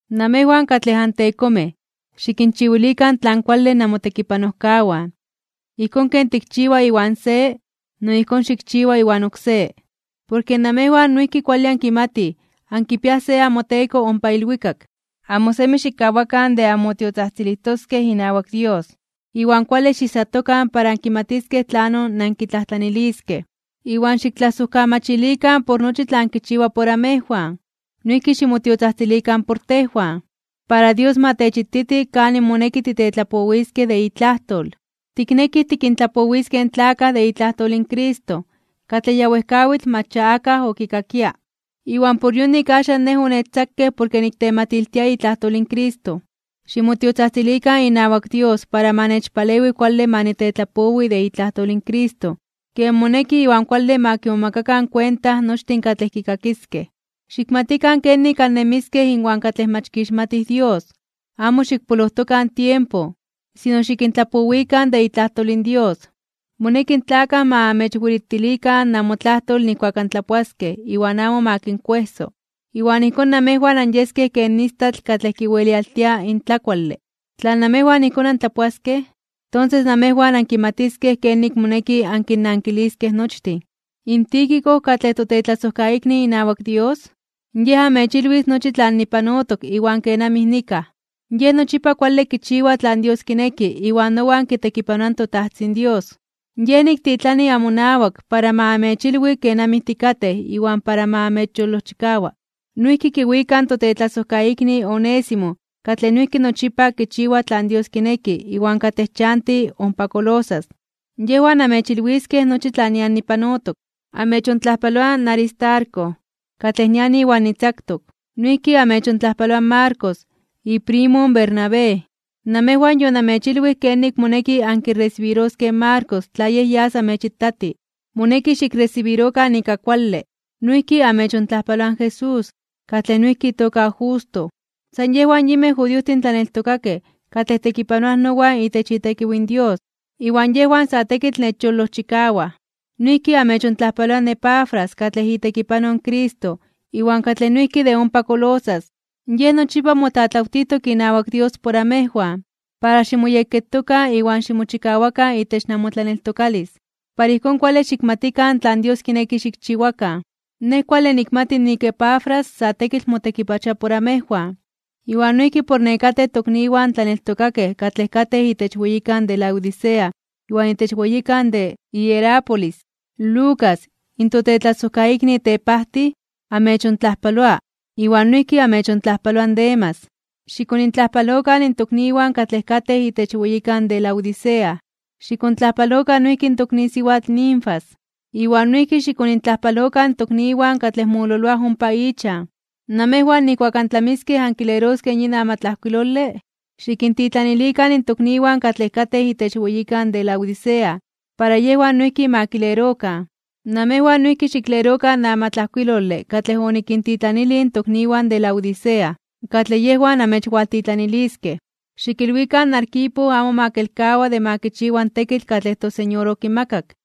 Namejwan katlej antekomej, xikinchiwilikan tlan kuale namotekipanojkawan. Ijkón ken tikchiwa iwan se, no ijkón xikchiwa iwan oksé. Porke namejwan noijki kuale ankimatij nik ankipiaj se amoTeko ompa ilwikak. Amo semi xikkawakan de anmotiotzajtzilijtoskej inawak Dios, iwan kuale xiijsatokan para ankimatiskej tlanon nankitlajtlaniliskej, iwan xiktlasojkamachilikan por nochi tlan kichiwa por amejwan. Noijki ximotiotzajtzilikan por tejwan. Para Dios ma techititi kanin moneki titetlapowiskej de itlajtol. Tiknekij tikintlapowiskej in tlakaj de itlajtol in Cristo katlej ya wejkawitl mach ya akaj okikakia. Iwan por yonik axan nej onechtzakej porke niktematiltia itlajtol in Cristo. Ximotiotzajtzilikan inawak Dios para ma nechpalewi kuale ma nitetlapowi de itlajtol in Cristo ken moneki iwan kuale ma kimomakakan kuenta nochtin katlej kikakiskej. Xikmatikan kenik annemiskej inwan katlej mach kixmatij Dios, amo xikpolojtokan tiempo, sino xikintlapowikan de itlajtol in Dios. Moneki in tlakaj ma amechwelitilikan namotlajtol nijkuak antlapoaskej iwan amo ma kinkuejso. Iwan ijkón namejwan anyeskej ken istatl katlej kiwelialtia in tlakuale. Tla namejwan ijkón antlapoaskej, tonses namejwan ankimatiskej kenik moneki ankinnankiliskej nochtin. Tíquico, katlej totetlasojkaikni inawak Dios, yej amechilwis nochi tlan nipanotok iwan kenamij nikaj. Yej nochipa kuale kichiwa tlan Dios kineki iwan nowan kitekipanoa in toTajtzin Dios. Yej niktitlani amonawak para ma amechilwi kenamij tikatej iwan para ma amechyolojchikawa. Noijki kiwika in totetlasojkaikni Onésimo katlej noijki nochipa kichiwa tlan Dios kineki iwan katlej chanti ompa Colosas. Yejwan amechilwiskej nochi tlan nian tlapanotok. Amechontlajpaloa in Aristarco, katlej nian iwan nitzaktok. Noijki amechontlajpaloa in Marcos, iprimo in Bernabé. Namejwan yonamechilwij kenik moneki ankiresibiroskej in Marcos tla yej yas amechitati, moneki xikresibirokan ika kuale. Noijki amechontlajpaloa in Jesús, katlej noijki itoka Justo. San yejwan yinmej judiojtin tlaneltokakej katlej tekipanoaj nowan itech itekiw in Dios, iwan yejwan sa tekitl nechyolojchikawaj. Noijki amechontlajpaloa in Epafras katlej itekipanoj in Cristo iwan katlej noijki de ompa Colosas. Yej nochipa motlatlawtijtok inawak Dios por amejwan para ximoyekketokan iwan ximochikawakan itech namotlaneltokalis, para ijkón kuale xikmatikan tlan Dios kineki xikchiwakan. Nej kuale nikmati nik Epafras sa tekitl motekipachoa por amejwan, iwan noijki por nekatej tokniwan tlaneltokakej katlej katej itech weyikan de Laodicea iwan itech weyikan de Hierápolis. Lucas, in totetlasojkaikni tepajtij, amechontlajpaloa, iwan noijki amechontlajpaloa in Demas. Xikonintlajpalokan in tokniwan katlej katej itech weyikan de Laodicea. Xikontlajpalokan noijki in tokni siwatl Ninfas, iwan noijki xikonintlajpalokan in tokniwan katlej mololoaj ompa ichan. Namejwan nijkuak antlamiskej ankileroskej yin amatlajkuilole, xikintitlanilikan in tokniwan katlej katej itech weyikan de Laodicea para yejwan noijki ma kilerokan. Namejwan noijki xiklerokan in amatlajkuilole katlej onikintitlanilij in tokniwan de Laodicea, katlej yejwan amechwaltitlaniliskej. Xikilwikan in Arquipo amo ma kelkawa de ma kichiwa in tekitl katlej in toSeñor okimakak.